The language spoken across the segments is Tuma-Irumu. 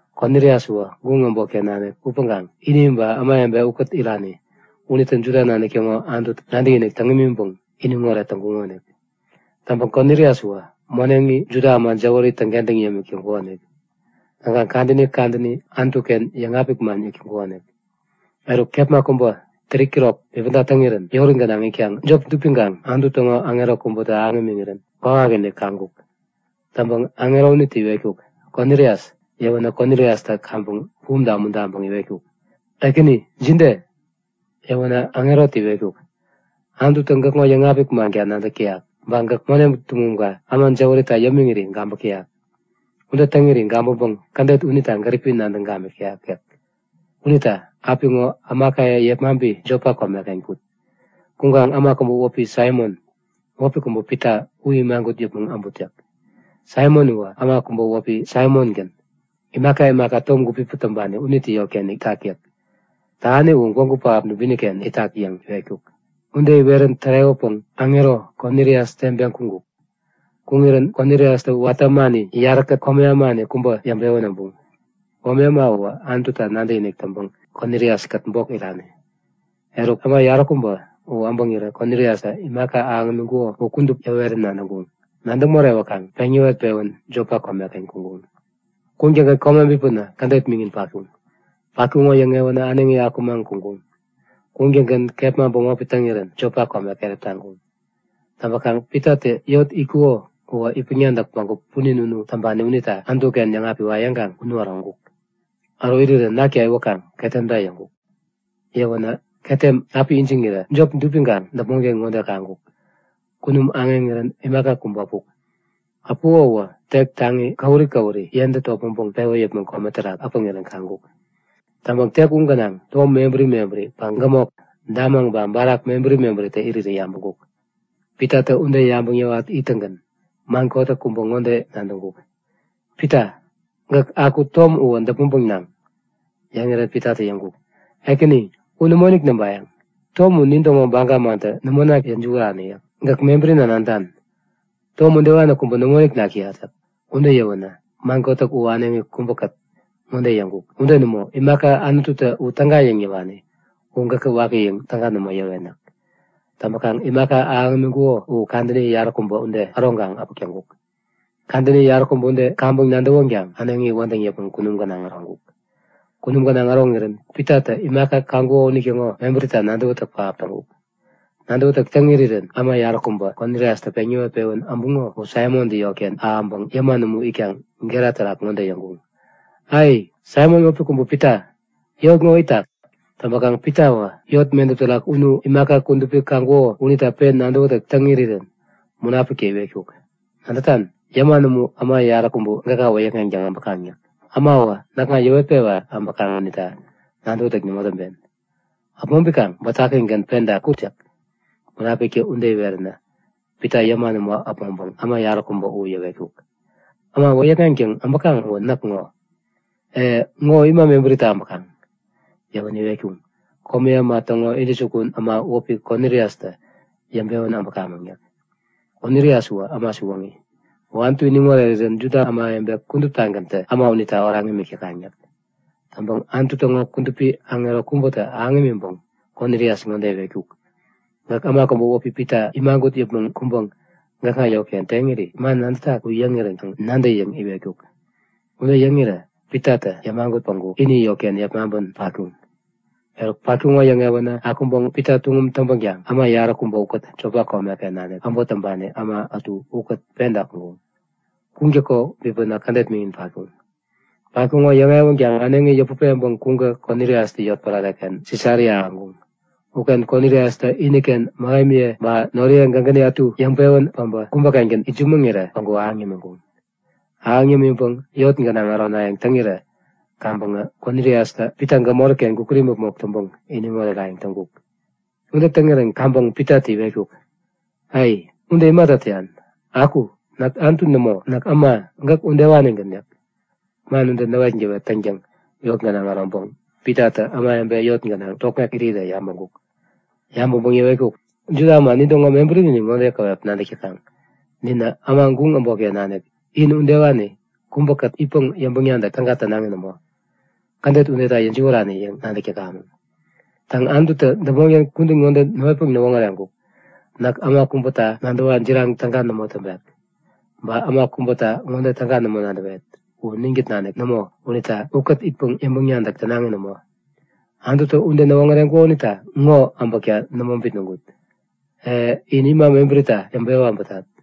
Konilias uwä guŋ äbotken nanik upäŋkaŋ ini ba ämawebe ukät irani unitä Juda nanik täŋo Anututa nadäkinik täŋ imiŋpäŋ iniŋoret täŋkuŋonik. Täŋpäŋ Konilias uwä moneŋi Juda äma jäwäri täŋkentäŋ yämik täŋkukonik. Täŋkaŋ kadäni kadäni Anutu-ken yäŋapik man yäk täŋkukonik. Eruk kepma kubä 3'kirok bipäda täŋirän yori gänaŋ itkaŋ jop dupiŋkaŋ Anutu täŋo aŋero kubätä ahäŋ imiŋirän kwawakinik kaŋkuk. Täŋpäŋ aŋero unitä iwetkuk; Konilias! Yäwänä Koniliastä kaŋpäŋ bumta umuntaŋpäŋ iwetkuk; Ekäni, jide? Yäwänä aŋerotä iwetkuk; Anututä gäkŋo yäŋapik manka nadäk täyak. Ba gäk moneŋ tuŋumka äma jäwärita yämiŋiri gabäk täyak. Ude täŋiri gabäŋpäŋ kädet unita gäripi nadäŋ gamik täyak yäk. Unita apiŋo ämakaye yepmaŋpi Jopa komeken kut. Kuŋkaŋ äma kubä wäpi Saimon, wäpi kubä Pita u imagut yäpmäŋ äbut yäk. Saimon uwä äma kubä wäpi Saimongän, imaka imaka tom gupipäŋ täŋpani unitä yotken itak yäk. Tähani u gwägu pähap dubini-ken itak yäŋ iwetkuk. Ude iwerän tärewäpäŋ aŋero Konilias teŋpeŋ kuŋkuk. Kuŋirän Koniliastä watä ämani yaräkät komi ämani kubä yäŋpewän äbuŋ. (Komi äma u Anututa nadäkinik täŋpäŋ Konilias-kät bok irani.) Eruk äma yaräkubä u äbäŋirä Koniliastä imaka ahäŋ imiŋkuko u kudup yäwerän nadäŋkuŋ. Nadäŋ morewäkaŋ peŋ yäwet-pewän Jopa komeken kuŋkuŋ. Kuŋtäŋgän kome bipänä kädet miŋin patkuŋ. Patkuŋo yäŋewänä äneŋi akumaŋ kuŋkuŋ. Kuŋtäŋgän kepma bämop täŋirän Jopa kome keräp taŋkuŋ. Täŋpäkaŋ Pitatä yot itkuko uwä itpäŋ-nadäk bägup punin unu täŋpani unita Anutu-ken yäŋapiwa yäŋkaŋ unu äroŋkuk. Äro irirän nakta iwäkaŋ ketemta yäŋkuk. Yäwänä ketem api ijiŋirä jop dupiŋkaŋ däpmonken ŋode kaŋkuk; Kunum aŋeŋirän imaka kubä äpuk. Äpuko uwä tek taŋi käwuri käwuri yentä topmäŋpäŋ pewä yäpmäŋ kome terak äpäŋirän kaŋkuk. Täŋpäŋ tek u gänaŋ tom mebäri mebäri ba gämok, damaŋ ba barak mebäri mebäritä irirä yabäŋkuk. Pitatä ude yabäŋ yäwat ittäŋgän man kotäk kubä ŋode nadäŋkuk; Pita, gäk aku tom uwä däpmäŋpäŋ naŋ! Yäŋirän Pitatä yäŋkuk; Ekäni, u nämoinik näŋpayäŋ! Tom u nintäŋo baga mantä nämo nakta yäjiwärani yäk. Ämatä u naŋpäŋ bänepi täŋpä waneŋ. Gäk mebärina nadätan, tom udewani kubä nämoinik nak täyat yäk. Ude yäwänä man kotäk u äneŋi kubäkät ŋode yäŋkuk; Ude nämo! Imaka Anututä u täga yäŋ yäwani u gäkä waki yäŋ täga nämo yäwen yäk. Täŋpäkaŋ imaka ahäŋ imiŋkuko u kadäni yaräkubä ude äroŋkaŋ äpäk täŋkuk. Kadäni yaräkubä ude kaŋpäŋ nadäwänkaŋ äneŋi wädäŋ yäpmäŋ kunum gänaŋ äroŋkuk. Kunum gänaŋ äroŋirän Pitatä imaka kaŋkuko unitäŋo mebärita nadäwätäk pähap täŋkuk. Nadäwätäk täŋ irirän äma yaräkubä Koniliastä peŋ yäwet-pewän äbuŋo u Saimontä yotken ahäŋpäŋ yäman umu itkaŋ gera terak ŋode yäŋkuŋ; Ai, Saimon wäpi kubä Pita, yot ŋo itak? Täŋpäkaŋ Pitawä yot medäp terak unu imaka kudupi kaŋkuko unita pen nadäwätäk täŋ irirän Munapiktä iwetkuk; Nadätan? Yäman umu äma yaräkubä gäka wäyäkŋeŋtäŋ äbäkaŋ yäk. Äma uwä näkŋa yäwetpewa äbäkaŋ unita nadäwätäk nämo täŋpen. Äpmoŋpikaŋ bätakigän penta kut yäk. Munapiktä ude iweränä Pita yäman umu äpmoŋpäŋ äma yaräkubä u yäwetkuk; Äma wäyäkŋeŋtäŋ äbäkaŋ uwä näk ŋo. E, ŋo ima mebärita äbäkaŋ? Yäwänä iwetkuŋ; Komi äma täŋo intäjukun äma wäpi Koniliastä yäŋpewän äbäkamäŋ yäk. Konilias uwä äma siwoŋi. U Anutu iniŋ orerirän Juda ämawebe kuduptagäntä äma unita oraŋ imik täkaŋ yäk. Täŋpäŋ Anutu täŋo kudupi aŋero kubätä ahäŋ imiŋpäŋ Konilias ŋode iwetkuk; Gäk äma kubä wäpi Pita imagut yäpmäŋ kuŋpäŋ gäkŋa yotken teŋiri man nadätak u yäŋirän kaŋ nadä yäŋ iwetkuk. Ude yäŋirä Pitatä yämagut päŋku ini yotken yepmaŋpän patkuŋ. Eruk, patkuŋo yäŋewänä akuŋpäŋ Pita tuŋum täŋpänkaŋ äma yaräkubä ukät Jopa komeken nanik äbot täŋpani äma ätu ukät penta kuŋkuŋ. Kuŋtäko bipänä kädet miŋin patkuŋ. Patkuŋo yäŋewänkaŋ äneŋi yäput peŋpäŋ kuŋkä Koniliastä yotpärare-ken Sisaria ahäŋkuŋ. Uken Koniliastä iniken mähemiye ba noriye gägäni ätu yäŋpewän päbä kubä-kengän itsämäŋirä päŋku ahäŋ yämiŋkuŋ. Ahäŋ yämiŋpäŋ yot gänaŋ ärowayäŋ täŋirän kaŋpäŋä Koniliastä Pita gämori-ken gukut imäpmok täŋpäŋ iniŋ orerayäŋ täŋkuk. Ude täŋirän kaŋpäŋ Pitatä iwetkuk; Ai! Ude imata täyan? Aku! Näk Anutu nämo, näk äma, gäk udewanigän yäk. Man ude näwetgäwet täŋtäŋ yot gänaŋ äroŋpäŋ Pitatä ämawebe yot gänaŋ tokŋek irirä yabäŋkuk. Yabäŋpäŋ yäwetkuk; Juda äma nintäŋo mebärinin ŋode käwep nadäk täkaŋ; Ninä, äma guŋ äbotken nanik in udewani kubäkät itpäŋ yäŋpäŋ-nadäk täga tänaŋi nämo. Kädet udeta yäjiwärani yäŋ nadäk täkamäŋ. Täŋ, Anututä däpmonken kudän ŋode näwetpäŋ näwoŋäreŋkuk; Näk äma kubäta nadäwa jiraŋ täga nämo täŋpek, ba äma kubäta ŋode täga nämo nadäwet; U ninkät nanik nämo unita ukät itpäŋ yäŋpäŋ-nadäk tänaŋi nämo. Anututä ude näwoŋäreŋkuko unita ŋo äbäkta nämo bitnäŋkut. E, in ima mebärita yäŋpewä äbätat?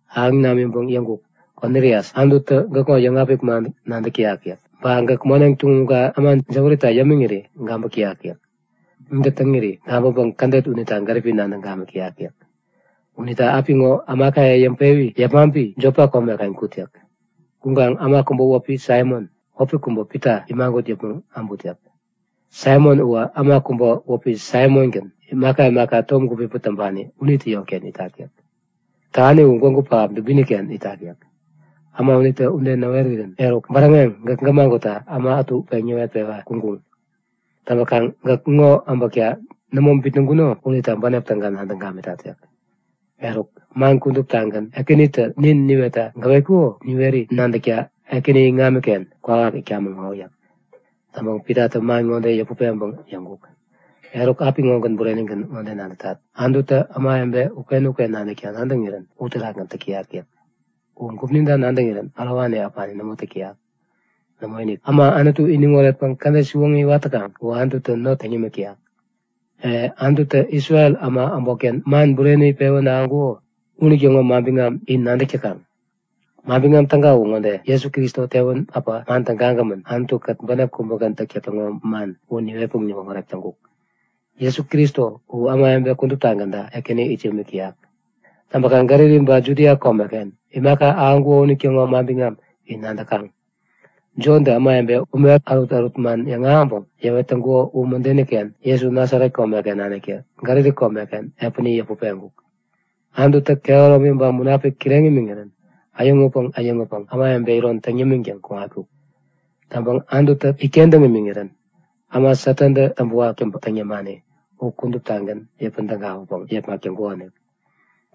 Ahäŋ namiŋpäŋ yäŋkuk; Konilias, Anututä gäkŋo yäŋapik man nadäk täyak yäk. Ba gäk moneŋ tuŋumka äma jäwärita yämiŋiri gabäk täyak yäk. Ude täŋiri gabäŋpäŋ kädet unita gäripi nadäŋ gamik täyak yäk. Unita apiŋo ämakaye yepmaŋpi Jopa komeken kut yäk. Kuŋkaŋ äma kubä wäpi Saimon, wäpi kubä Pita imagut yäpmäŋ äbut yäk. Saimon uwä äma kubä wäpi Saimongän, imaka imaka tom gupipäŋ täŋpani unitä yotken itak yäk. Tähani u gwägu pähap dubini-ken itak yäk. Äma unitä ude näwerirän eruk, bäräŋeŋ gäk gämagutta äma ätu peŋ yäwetpewa kuŋkuŋ. Täŋpäkaŋ gäk ŋo äbäkta nämo bitnäŋkuno unita bänep täga nadäŋ gamitat yäk. Eruk, man kuduptagän Ekänitä nin niwetta gäwetkuko u niweri nadäkta, Ekäni iŋamiken kwawak itkamäŋ ŋo yäk. Täŋpäŋ Pitatä man ŋode yäput peŋpäŋ yäŋkuk; Eruk, apiŋogän burenigän ŋode nadätat; Anututä ämawebe uken-uken nanikta nadäŋirän uterakgän täk täyak yäk. U gupninta nadäŋirän ärowani äpani nämo täk täyak. Nämoinik, äma Anutu iniŋ oretpäŋ kädet siwoŋi iwat täkaŋ uwä Anututä not täŋ yämik täyak. E, Anututä Isrel äma äbotken man bureni pewän ahäŋkuko unitäŋo manbiŋam in nadäk täkaŋ. Manbiŋam Täga uwä ŋode; Jesu Kristo tewän äpä man tägagämän, Anutu-kät bänep kubägän täktäk täŋo man u niwetpäŋ niwoŋärek täŋkuk. Jesu Kristo u ämawebe kuduptagänta Ekäni it yämik täyak. Täŋpäkaŋ Galili ba Judia komeken imaka ahäŋkuko unitäŋo manbiŋam in nadäkaŋ. Jontä ämawebe ume ärutärut man yäŋahäŋpäŋ yäwet täŋkuko u mädeni-ken Jesu Nasaret komeken naniktä Galili komeken epäni yäput peŋkuk. Anututä kehäromi ba Munapik kireŋ imiŋirän äyäŋutpäŋ äyäŋutpäŋ ämawebe iron täŋ yämiŋtäŋ kuŋatkuk. Täŋpäŋ Anututä itkentäŋ imiŋirän äma Satantä täŋpäwak täŋ yämani u kuduptagän yäpän tägawäpäŋ yepmak täŋkukonik.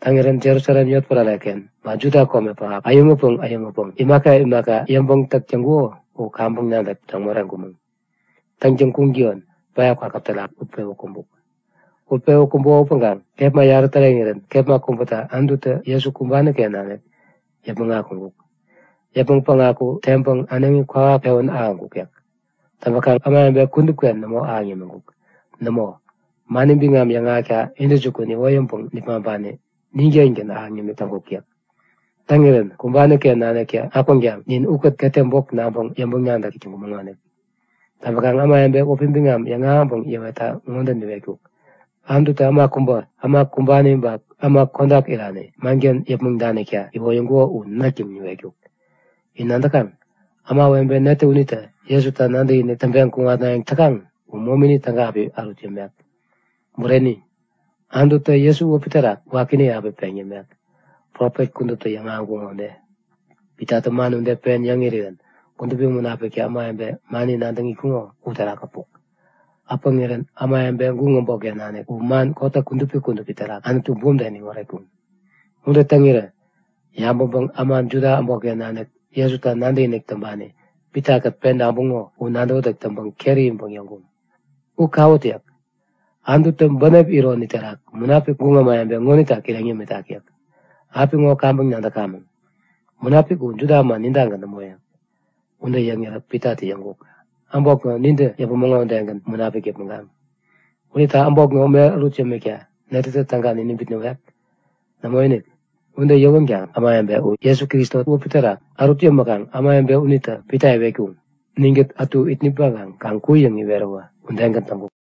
Täŋirän Jerusalem yotpärare-ken ba Juda kome pähap äyäŋutpäŋ äyäŋutpäŋ imaka imaka yäŋpäŋ-täk täŋkuko u kaŋpäŋ nadäk täŋ moreŋkumäŋ. Täŋtäŋ kuŋtäyon päya kwakäp terak utpewä kumbuk. Utpewä kumbuko upäŋkaŋ kepma yarä täreŋirän kepma kubäta Anututä Jesu kumbani-ken nanik yäpmäŋ akuŋkuk. Yäpmäŋ päŋaku teŋpäŋ äneŋi kwawak pewän ahäŋkuk yäk. Täŋpäkaŋ ämawebe kudupken nämo ahäŋ yämik täŋkuk. Nämo, mani biŋam yäŋahäkta intäjukun iwoyäŋpäŋ nipmaŋpani nin-kengän ahäŋ nimik täŋkuk yäk. Täŋirän kumbani-ken naniktä akwänkaŋ ninä ukät ketem bok naŋpäŋ yäŋpäŋ-nadäk täk täŋkumäŋonik. Täŋpäkaŋ ämawebe wäpi biŋam yäŋahäŋpäŋ yäwetta ŋode niwetkuk; Anututä äma kubä, äma kumbani ba äma kodak irani manken yäpmäŋ danikta iwoyäŋkuko u näk yäŋ niwetkuk. In nadäkaŋ? Ämawebe netä unitä Jesuta nadäkinik täŋpeŋ kuŋatnayäŋ täkaŋ uwä momini täga api ärut yämek. Bureni, Anututä Jesu wäpi terak wakini api peŋ yämek, profet kuduptä yäŋahäŋkuŋo ude. Pitatä man ude pen yäŋ irirän Kudupi Munapiktä ämawebe mani nadäŋ itkuŋo uterak äpuk. Äpäŋirän ämawebe guŋ äbotken nanik u man kotäk kudupi kudupi terak Anutu bumta iniŋ oretkuŋ. Ude täŋirä yabäŋpäŋ äma Juda äbotken nanik Jesuta nadäkinik täŋpani Pitakät penta äbuŋo u nadäwätäk täŋpäŋ keri iŋpäŋ yäŋkuŋ; U kawut! yäk. Anututä bänep ironi terak Munapik guŋ ämawebe ŋonita kireŋ yämitak yäk. Apiŋo kaŋpäŋ nadäkamäŋ, Munapik u Juda äma nintagän nämo yäk. Ude yäŋirä Pitatä yäŋkuk; Äbot ŋo, nintä yäpumäŋo udegän, Munapik yäpmäŋkaŋ. Unita äbot ŋo ume ärut yämikta netätä täga niniŋ bitnäwek? Nämoinik! Ude yäwänkaŋ ämawebe u Jesu Kristo wäpi terak ärut yämiŋkuŋ. Ärut yämäkaŋ ämawebe unitä Pita iwetkuŋ; Ninkät ätu it nipmaŋkaŋ kaŋ ku yäŋ iweräwä udegän täŋkuk.